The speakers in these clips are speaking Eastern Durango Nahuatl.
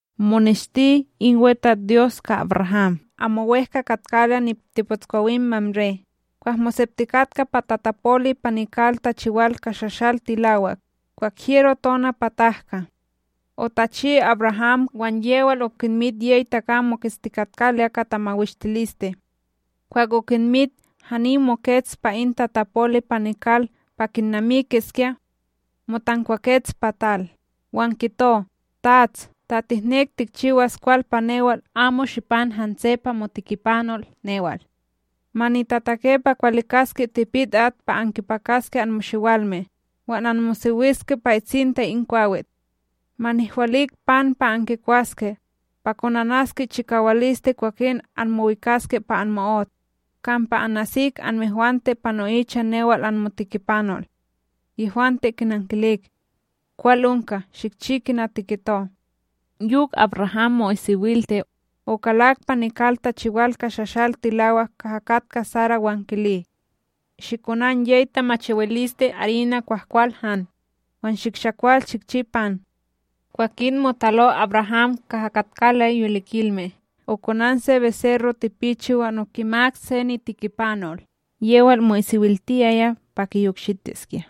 Moneshti in WeTatsDyos ka AbRaham amo wEhka katkaloya nitepotskwawim Mamré, kwah moseptikatka pa tatapoli pa nikal tachiwal ka shashal tilawak, kwah hyero tona pa tahka. Otachi AbRaham, wan yewal okinmit yey takam moketstikatkaloya ka tamawishtiliste. Kwah okinmit, hani mokets pa in tatapoli pa nikal pa kinnamikiskya. Motankwakets pa tal, wan kito: ―Tats, ta tihnek tikchiwas kwal pa newal, amo shipan hanse pa motikipanol newal. Ma nitatake pa kiwalikaske tipit at pa ankipakaske anmoshiwalme, wan anmosewiske pa itsinta in kwawit. Ma nihwalik pan pa ankikwaske, pa konanaske chikawaliste kwakin anmowikaske pa anmo'ot. Kampa anasik anmehwante pa no'icha newal anmotikipanol. Yehwante kinnankilik: ―Kwal onka, shikchi kina tikito! Yok AbRaham mo'isiwilte okalak pa nikal tachiwal ka shashal tilawak kaha katka Sara, wan kili: ―Shikonan yey tamachiwiliste arina kwahkwal han, wan shikshakwal shikchi pan. Kwakin motalo AbRaham kaha katkaloya yolikilme, okonan se beserro tipichi, wan okimak se nitikipanol, yewal mo'isiwiltiyaya pa kiyokshitiskya.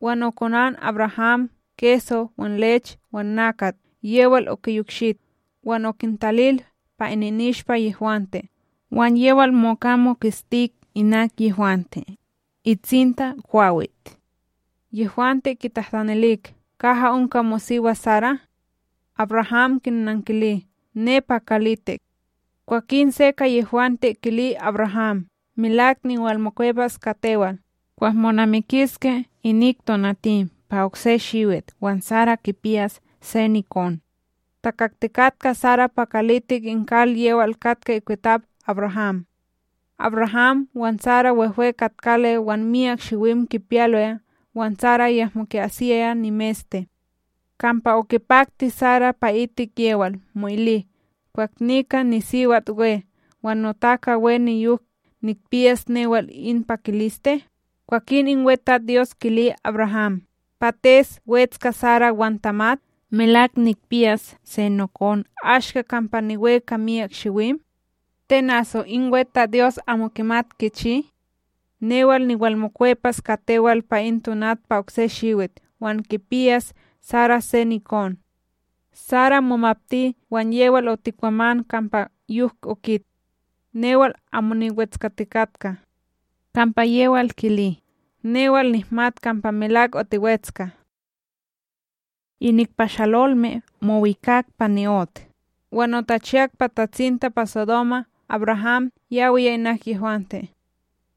Wan okonan AbRaham keso wan lech wan nakat yewal okiyokshit. Wan okintalil pa ininishpa yehwante, wan yewal moka moketstik inak yehwante, itsinta kwawit. Yehwante kitahtanilik: ―Kaha onka mosiwa Sara? AbRaham kinankili: ―Nepa kalitik. Kwakin se ka yehwante kili AbRaham: ―Melak niwalmokwepas ka tewal, kwah monamikiske inik tonatim pa okse shiwit wan Sara kipiyas se nikon. Takaktikatka Sara pa kalitik in kal, yewal katka ikwitap AbRaham. AbRaham wan Sara wehwe katkaloya wan myak shiwim kipiyaloya, wan Sara yahmo ki'asiyaya nimeste. Kampa okipakti Sara pa'itik yewal mo'ili: “Kwah nika nisiwat we, wan notaka we, niyok nikpiyas newal in pakiliste?” Kwakin in WeTatsDyos kili AbRaham: ―Pates wetska Sara wan tamat? Melak nikpiyas se nokon ashka kampa niwe, ka myak shiwim? Ten aso in WeTatsDyos amo kimat kichi? Newal niwalmokwepas ka tewal pa in tonat pa okse shiwit, wan kipiyas Sara se nikon. Sara, momapti wan yewal otikwaman kampa yok okit: ―Newal amo niwetskatikatka. Kampa yewal kili: ―Newal nihmat kampa melak otiwetska. Inik pashalolme mowikak pa ni'ot wan otachiyak pa tatsinta pa Sodoma. AbRaham yawiya inak yehwante.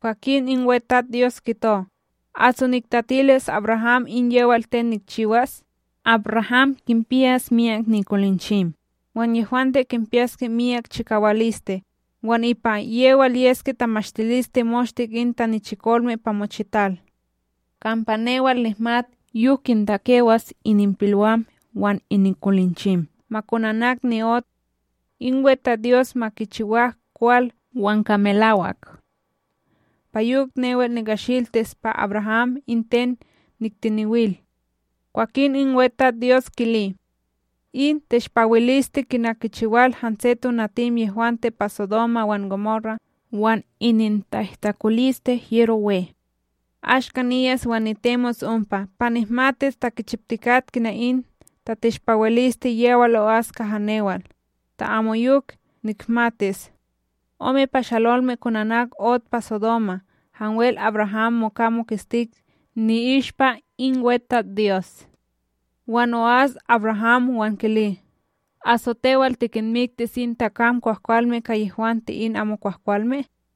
Kwakin in WeTatsDyos kito: “Aso niktatilis AbRaham in yewal ten nikchiwas? AbRaham kinpiyas myak nikolinchim wan yehwante kinpiyaske miyak chikawaliste, wan ipa yewal yeske tamashtiliste moshte in tanichikolme pa mochital. Kampa newal nihmat yok kintakewas ininpilwam wan ininkolinchim, ma konanak ni'ot in WeTatsDyos ma kichiwak kwal wan ka melawak. Pa yok newal nikashiltis pa AbRaham in ten niktiniwil.” Kwakin in WeTatsDyos kili: ―In teshpawiliste kina kichiwal hanse tonatim yehwante pa Sodoma wan Gomora, wan ininta'ihtakoliste hyero we. Ashka niyas wan nitemos ompa, pa nihmatis ta kichiptikat kina in tateshpawiliste yewal o'as kaha newal; ta amoyok, nihmatis. Ome pashalolme konanak ot pa Sodoma, hanwel AbRaham moka moketstik ni'ishpa in WeTatsDyos. Wan o'as AbRaham wan kili: ―Aso tewal tikinmiktis in takam kwahkwalme ka yehwante in amokwahkwalme?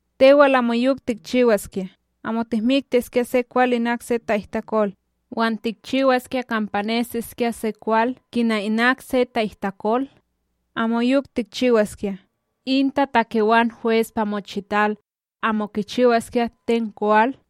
Tewal amoyok tikchiwaskya! Amo tihmiktiskya se kwal inak se ta'ihtakol, wan tikchiwaskya kampa nesiskya se kwal kina inak se ta'ihtakol? Amoyok tikchiwaskya! In tatakewan hwes pa mochital, amo kichiwaskya ten kwal?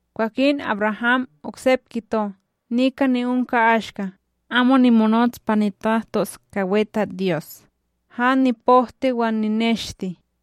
Kwakin AbRaham oksep kito: ―Nika ni'onka ashka, amo nimonots pa nitahtos ka WeTatsDyos, han nipohti wan nineshte.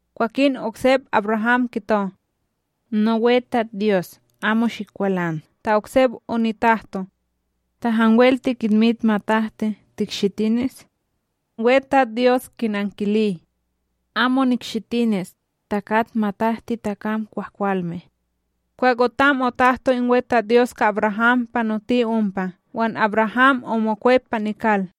Kwakin oksep AbRaham kito: ―NoWeTatsDyos amo shikwalan, ta oksep onitahto. Ta hanwel tikinmit matahti, tikshitinis. WeTatsDyos kinankili: ―Amo nikshitinis, ta kat matahti takam kwahkwalme. Kwah otam otahto in WeTatsDyos ka AbRaham, panoti ompa, wan AbRaham omokwep pa nikal.